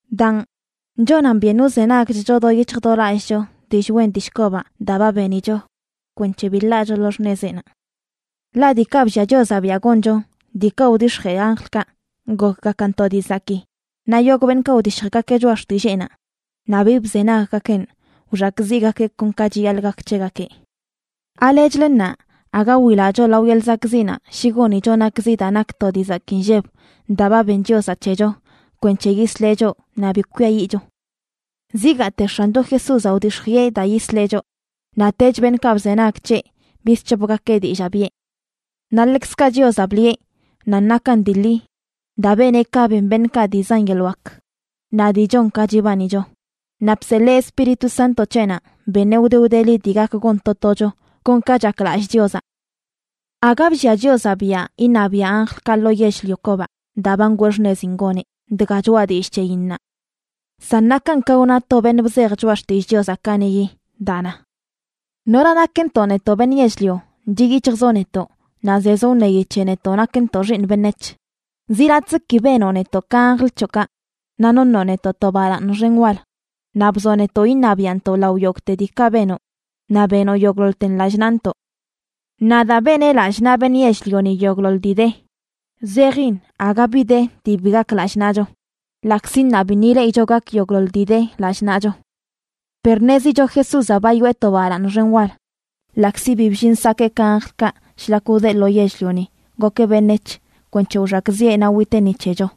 Daan, chonan byen wzenagchcho do yic̱hj do lallꞌcho dillꞌ wen dillꞌ kobaꞌ daa ba benicho kwenc̱he bi ḻaacho lo xṉezeꞌnaꞌ. Ḻaꞌ diikaꞌ bllia Chiozaꞌ biaꞌ goncho, diikaꞌ wdix̱jee anjlkaꞌ, gokgakan to dii zakii, naꞌ yogꞌ beṉꞌkaꞌ wdishjgakeꞌ choꞌa xtilleenaꞌ naꞌ bi bzenaggakeꞌn wxakꞌziꞌgakeꞌ kon ka chiyaḻꞌ gak c̱hegakeꞌ. ¿Alechlə ṉaa aga wilacho lao yeḻꞌ zakꞌziꞌnaꞌ shi gonicho nakzi daa nak to dii zakii nlleb daa ba ben Chiozaꞌ c̱hecho kwenc̱he yisleꞌ choꞌ naꞌ bi kwiayiꞌcho? Zigaate X̱ancho Jesúzaꞌ wdix̱jiꞌe daa yisleꞌ choꞌ, naꞌtech beṉꞌkaꞌ bzenag c̱heꞌ bizc̱hopgakeꞌ dillaa biꞌe. Naꞌ ḻekzkaꞌ Chiozaꞌ bliꞌe nan nakan dii ḻi daa beneꞌ ka ben beṉꞌkaꞌ dii zan yeḻꞌ wak naꞌ dii chon ka chibanicho, naꞌ bseḻee Espíritu Santo c̱heꞌnaꞌ beṉeꞌ wde wdeli dii gak gon to tocho kon ka chaklallꞌ Chiozaꞌ. Aga bllia Chiozaꞌ biaꞌ iṉabiaꞌ anjlkaꞌ lo yell-lio kobaꞌ daa ba ngwee xṉezin goneꞌ, dga choꞌa dillꞌ c̱heyin ṉaa. San nakan ka wna to beṉꞌ bzej Choꞌa Xtillꞌ Chiozaꞌ kaniꞌyi daa na: ¿Nora nakntoꞌ, netoꞌ beṉꞌ yell-lio, chiꞌ yic̱hjzoꞌ netoꞌ, naꞌ zezoꞌ wṉeyi c̱he netoꞌ nakntoꞌ xiiṉ beṉec̱h? Zi latꞌzə ki benoꞌ netoꞌ ka anjl c̱hoꞌkaꞌ, naꞌ noṉoꞌ netoꞌ to balaaṉ xen wal. Naꞌ bzoꞌ netoꞌ iṉabiaꞌntoꞌ lao yogꞌte diikaꞌ benoꞌ. Naꞌ benoꞌ yogꞌḻoḻten lallꞌ naꞌntoꞌ. Naꞌ daa beneꞌ lallꞌ naꞌ beṉꞌ yell-lioni yogꞌḻoḻ dii de, zejin aga bi de dii bi gak lallꞌ naꞌcho, ḻaꞌkzi ṉaa biṉꞌ ileꞌicho gak yogꞌḻoḻ dii de lallꞌ naꞌcho. Per ṉezicho Jesúzaꞌ ba yoꞌe to balaaṉ xen wal, ḻaꞌkzi bi bllin sakee ka anjlkaꞌ shlak wdeꞌ lo yell-lioni gokeꞌ beṉec̱h kwenc̱he wxakꞌziꞌe naꞌ witeꞌ ni c̱hecho.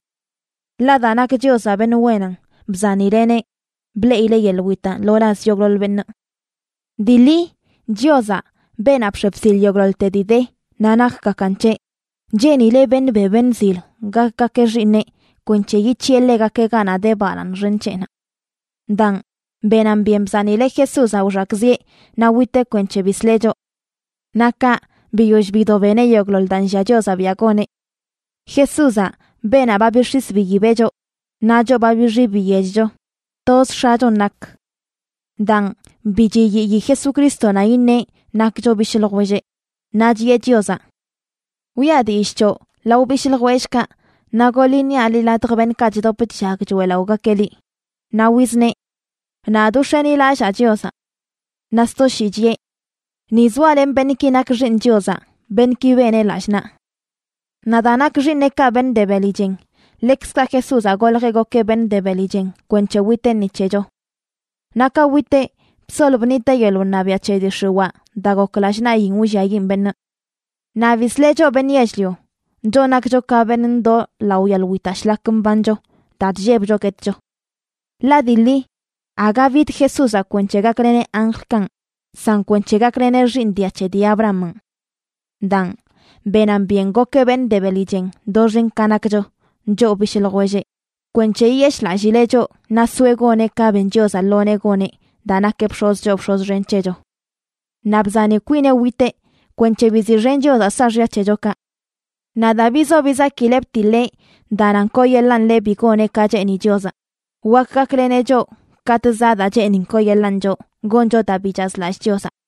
Ḻaꞌ daa nak Chiozaꞌ beṉꞌ wenan, bzanileꞌneꞌ bleꞌileꞌ yeḻꞌ witaꞌ lo laz yogꞌḻoḻ beṉꞌ. Dii ḻi, Chiozaꞌ, beenaꞌ bx̱e bsil yogꞌḻoḻte dii de naꞌ nakgakan c̱heꞌ, cheenileꞌ beṉꞌ be beṉꞌ zil gakgakeꞌ xiiṉeꞌ kwenc̱he yic̱hiꞌe ḻegakeꞌ ganaꞌ de balaaṉ xen c̱heꞌnaꞌ. Daan, benan byen bzanileꞌ Jesúzaꞌ wxakꞌziꞌe naꞌ witeꞌ kwenc̱he bisleꞌ choꞌ. Naꞌ kaꞌ, biyoll bido beneꞌ yogꞌḻoḻ daa nllia Chiozaꞌ biaꞌ goneꞌ. Jesúzaꞌ, beenaꞌ ba bix̱is biyibeꞌ choꞌ, naꞌ choꞌ ba bixi biyechcho, toz X̱achon nak. Daan, bi chiyiyi Jesucrístonaꞌ iṉeꞌ nakcho bishꞌ ljwelleꞌ. Naꞌ chiꞌe Chiozaꞌ: Wiꞌa dillꞌ c̱hoꞌ lao bishꞌ ljwellꞌkaꞌ, naꞌ goḻ iṉiaꞌ liꞌ ladj beṉꞌkaꞌ chdop chllag choeꞌlaꞌogakeꞌ liꞌ. Naꞌ wizneꞌ: Nadꞌ wx̱enilallaa Chiozaꞌ. Naꞌ sto shii chiꞌe: Ni zoalenꞌ beṉꞌki nak xiiṉ Chiozaꞌ, beṉꞌki beneꞌ lallꞌ naꞌ. Naꞌ daa nak xiiṉeꞌkaꞌ beṉꞌ de beli chen, ḻekzkaꞌ Jesúzaꞌ goljeꞌ gokeꞌ beṉꞌ de beli chen kwenc̱he witeꞌ ni c̱hecho. Naꞌ ka witeꞌ, bsol bṉiteꞌ yeḻꞌ wṉabiaꞌ c̱he dii x̱iwaa daa gok lallꞌ naꞌyin wlliayiꞌn beṉꞌ. Naꞌ bisleꞌ choꞌ beṉꞌ yell-lio, choꞌ nakcho ka beṉꞌ ndoo lao yeḻꞌ witaꞌ shlak mbancho daa chllebcho guetcho. Ḻaꞌ dii ḻi, aga bid Jesúzaꞌ kwenc̱he gakleneꞌ anjlkanꞌ, san kwenc̱he gakleneꞌ xiiṉ dia c̱he dii Abrahamanꞌ. Daan, benan byen gokeꞌ beṉꞌ de beli chen doxen ka nakcho, choꞌ bishꞌ ljwelleꞌ, kwenc̱he yiyeshꞌlallileꞌ choꞌ naꞌ soeꞌ goneꞌ ka ben Chiozaꞌ lo nee goneꞌ daa nakeꞌ bx̱oz choo bx̱oz xen c̱hecho. Naꞌ bzani kwineꞌ witeꞌ kwenc̱he biziꞌxen Chiozaꞌ saaxya c̱hechokaꞌ. Naꞌ daa bizo bizakileꞌ btiḻeꞌ daa nan kooyeḻaan ḻeꞌ bi goneꞌ ka cheeni Chiozaꞌ, wak gakleneꞌ choꞌ katꞌ zaꞌ daa cheenin kooyeḻaan choꞌ goncho daa bi chazlallꞌ Chiozaꞌ.